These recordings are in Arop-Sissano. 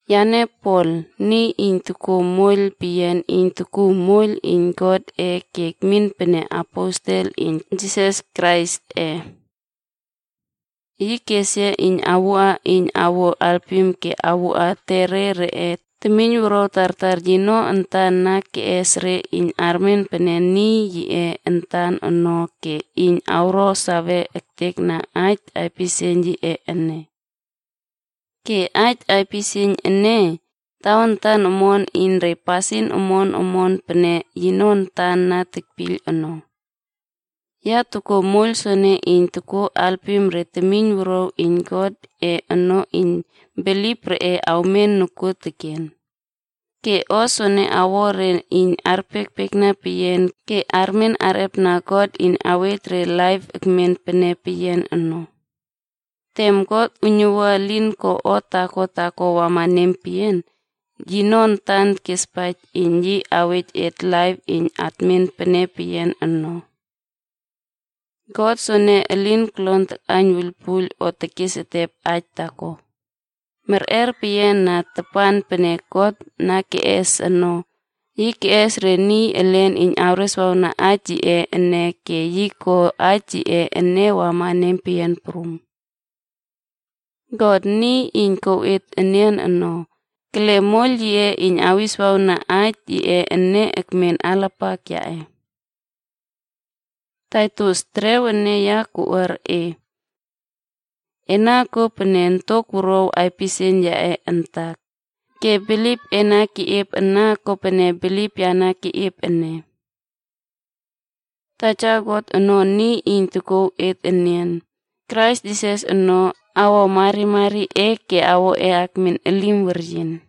Yane Pol, niy iyn tokuo moiyl peyian iyn tokuw moiyl iyn Godꞌe ke tekmin pene aposela iyn Jisas Kraisꞌe. Yi kes yia kowua iyn awuo alpim ke awuꞌa etere reꞌe temiynwuruaw tartar yino antan na keꞌes re iyn armen pene niy yiꞌe antan ono ke iyn re awro sawe ektekna aij aipisieiyn yiꞌe ene. Ke aij aipisieiyn ene, tawantan omon iyn re pasin omon omon pene yino antan na tekpiyl ono. Ya tokuo moiyl soene iyn tokuo alpim re temiynwuruaw iyn Godꞌe ono iyn bilip reꞌe awmen nokuoteken. Ke o soene awo re iyn arpiekpiekna peyian ke armen arꞌepna God iyn awej re laip tekmen pene peyian ono. Tem God uiynuwua elin ko o taako taako wama nempeyian, yino antan kespaij iyn yi awej et laip iyn tekmen pene peyian ono. God soene elin kolon takꞌaiyn wuiylpuiyl o tekes etep aij taako. Merꞌer peyian na tapan pene God na keꞌes ono, yi keꞌes re niy elen iyn kereswawna aij yiꞌe ene ke yi ko aij yiꞌe ene wama nempeyian prum. God, niy iyn tokouw et enian ono, kele moiyl yiꞌe iyn awiswawna aij yiꞌe ene, ekmen alapak yaꞌe. Taitus, terew ene ya koꞌuar e. Ena kuo pene ontok wuruaw aipisieiyn yaꞌe antak, ke bilip e na keꞌiep ana pene bilip yape na keꞌiep ene. Taja God ro niy iyn tokouw et enian, Krais Jisas ono, awro marimari e ke awro e akmin elim weryin.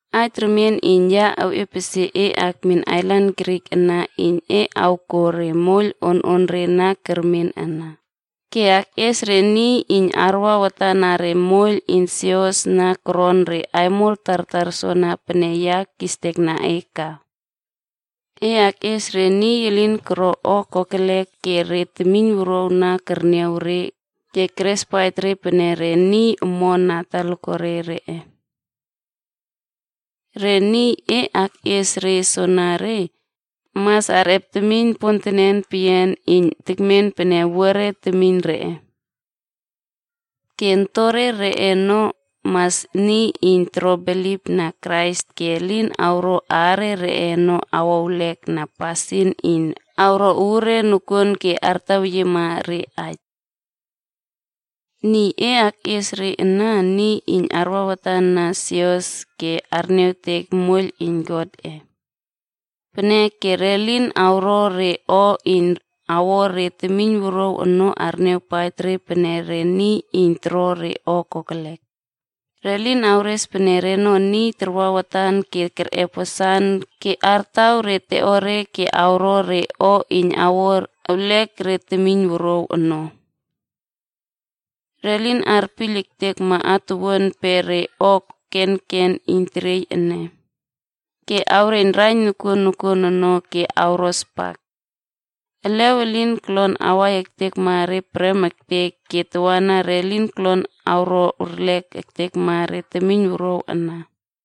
Aij remien iyn ya iepesie e akmin ailan Krit ana iyn e awkuo re moiyl ononre na kermen ana, ke akꞌies re niy iyn arwa watan na moiyl iyn sios na koron re aimol tartar soana pene ya kistekna e ka. E akꞌies re niy elin koro o kokelek ke re temiynwuruaw ana kerniaw re ke kerespaij re pene re niy omon na talakuare reꞌe. Re niy e akꞌies re soenere, mas arꞌep temiyn pontenen peyian iyn tekmen pene owuare temiyn reꞌe. Ke ontore reꞌe ono, mas re niy iyn toro bilipna Krais ke elin awro aare reꞌe ono awoewlek na pasin iyn awro uure nokuon ke artaweyiema re aij. Niy e akꞌies re ana, niy iyn arwa watan na sios ke arniawtek moiyl iyn Godꞌe. Peneke re lin awro re o iyn awo re temiynwuruaw ono arniawpaij re pene re niy iyn toro re o kokelek. Re lin awres pene reno niy tarwa watan ke kerꞌep wasan ke artaw re teꞌore ke awro re o iyn awro erlek re temiynwuruaw ono. Re lin arpiyl ektekma atuwuan pe re o kenken iyn teriey ene, ke awreiyn raiyn nokuon nokuon ono ke awro spak. Elew elin kolon awai ektekma re prem ektek ke tawana re lin kolon awro erlek ektekma re temiynwuruaw ana.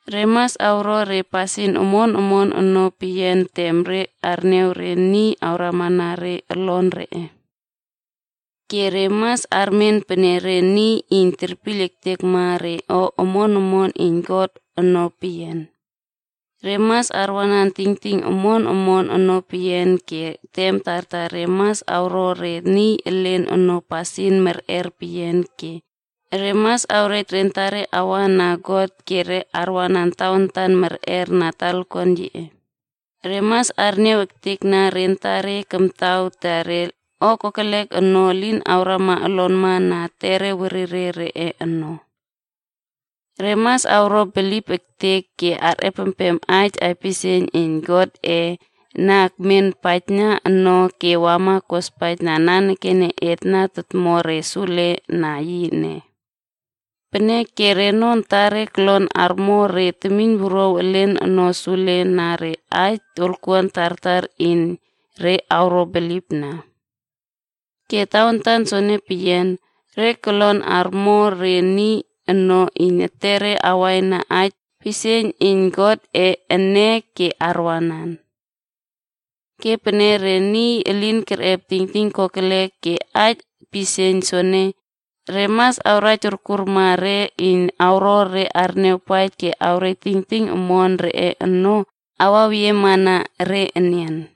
Re mas awro re pasin omon omon ono peyian tem re arniaw re niy awramana re olon reꞌe. Ke re mas armen pene re niy iyn terpiyl ektekma re o omon omon iyn God ono peyian. Re mas arwanan tingting omon omon ono peyian, ke tem tartar re mas awro re niy elen ono pasin merꞌer peyian, ke re mas awrej re antare arwa na God ke arwanan tawantan merꞌer na talakuan yiꞌe, Re mas arniaw ektekna re antare kamtaw ta re o kokelek ono elin awrama olonma na etere werire reꞌe ono. Re mas awro bilip ektek ke arꞌepempem aij pisieiyn iyn Godꞌe na kemen paijna no ke wama kospaijna nanekene et na tomo re sule na yi ene. Peneke reno antare kolon armo re temiynwuruaw elen ono sule na re aij wolkuan tartar iyn re awro bilipna. Ke tawantan soene peyian, re kolon awro re niy ono iyn etere awaina aij pisieiyn iyn Godꞌe ene ke arwanan. Ke pene re niy elen arꞌep tingting kokelek na aij pisieiyn soene, re mas awraij orkurma re iyn awro re arniawpaij ke awrej tingting omon reꞌe ono awaweyiema na re enian.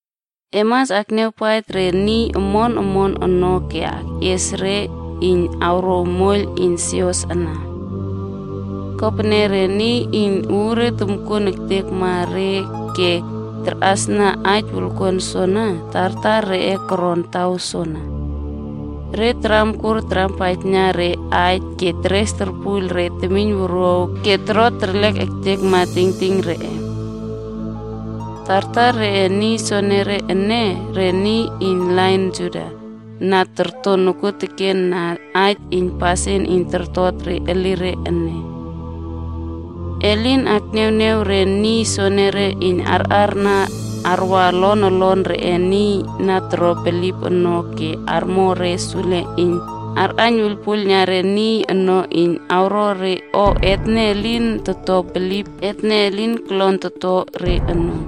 E mas akniawpaij re niy omon omon ono ke akꞌies re iyn awrouw moiyl iyn sios ana. Kopene re niy iyn uure tomkuon ektekma re ke tarꞌasna aij wolkuan soene, tartar reꞌe koron taw soana. Re taramkur tarampaijna re aij ke teres torpuiyl re temiyn wuruaw ke toro terlek ektekma tingting reꞌe. Tartar reꞌe niy soenere ene, re niy iyn lain Juda na torto nokuoteken na aij iyn pasin iyn tortot re elireb ene. E lin akniawniaw re niy soenere iyn arꞌarna arwa olon olon reꞌe niy na toro bilip ono ke armo re sule iyn arꞌaiyn wuiylpuiylna re niy ono iyn awro re o etne niy iyn toto bilip ene elin kolon ato re ono.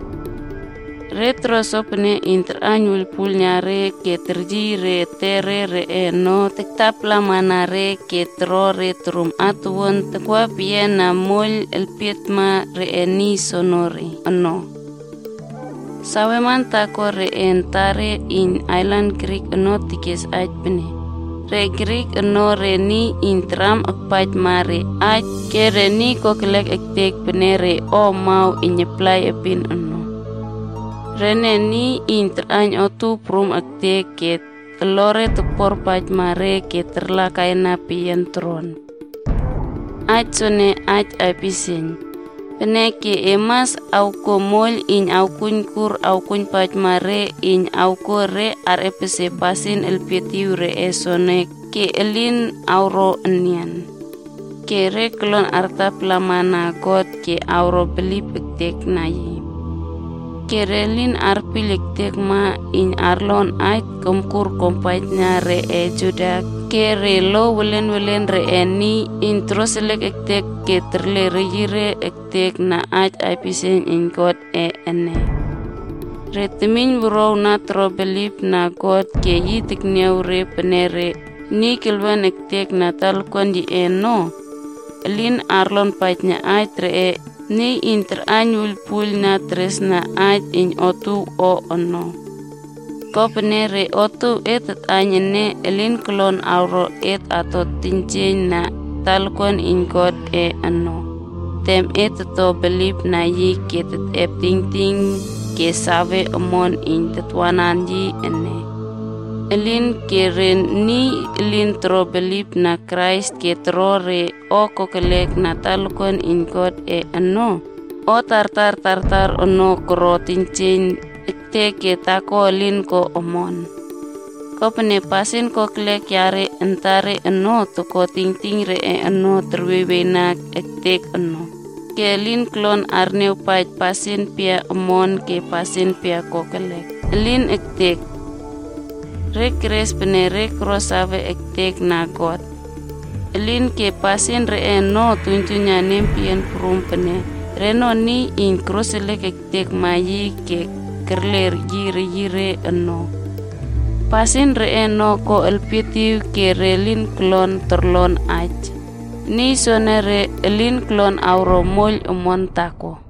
Re toro sopene iyn tarꞌaiyn wuiylpuiylna re ke teryiy re etere ono iyn taktapalamana re ke toro re torum atuwuan takwa peyiana moiyl elpietma reꞌe niy soonore ono. Saweman taako reꞌe antare iyn ailan Krit ono kes aij pene, “Re Krit ono re niy iyn taram akpaijma re aij ke re niy kokelek ektek pene re o amaw iyn aplai epin ono. Rene niy iyn tarꞌaiyn otuow prum ektek ke olore tokporpaijma re ke tarlakaina peyian toron.” Aij soene, aij aipisieiyn. Peneke e mas awkuo moiyl iyn awkuoijkur awkuoijpaijma re iyn awkuo re arꞌepesie pasin elpietiw reꞌe soono ke elin awro enian. Ke re kolon artapalamana God ke awro bilip ektekna yi. Ke re lin arpiyl ektekma iyn arlon aij komkur kuampaijna reꞌe Juda ke re lo welen welen reꞌe niy iyn toroseliek ektekma ke terle reyire ektek na aij pisieiyn iyn Godꞌe ene. Re temiyn wuruaw na toro bilipna God ke yi tekniaw re pene re niy kelwen ektekna talakuan yiꞌe ono, elin arlonpaijna aij reꞌe niy iyn tarꞌaiyn wuiylpuiyl na teresna aij iyn otuow o ono. Kopene re otuow et tatꞌaiyn ene elin kolon awro et ato teiynjieiyn na talakuan iyn Godꞌe ono tem et toto bilipna yi ke tetꞌep tingting ke sawe omon iyn tatwanan yi ene.c Elinke re niy elin toro bilipna Krais ke toro re o kokelek na talakuan iyn Godꞌe ono, o tartar tartar ono koro teiynjieiyn ektek ke taako elin ko omon. Kopene pasin kokelek reꞌe antare ono toko tingting reꞌe ono kerwieywieyna ektek ono, ke elin kolon arniawpaij pasin pia omon ke pasin pia kokelek. Elin ektek! Re teres pene re koro sawe ektekna God. Elinke pasin reꞌe ono toktuiynjuiyna nempeyian prum pene reno niy iyn koroseliek ektekma yi ke kerle yi reyire ono. Pasin reꞌe ono ko elpietiw ke re lin kolon torlon aij. Niy soenere, elin kolon awro moiyl omon taako.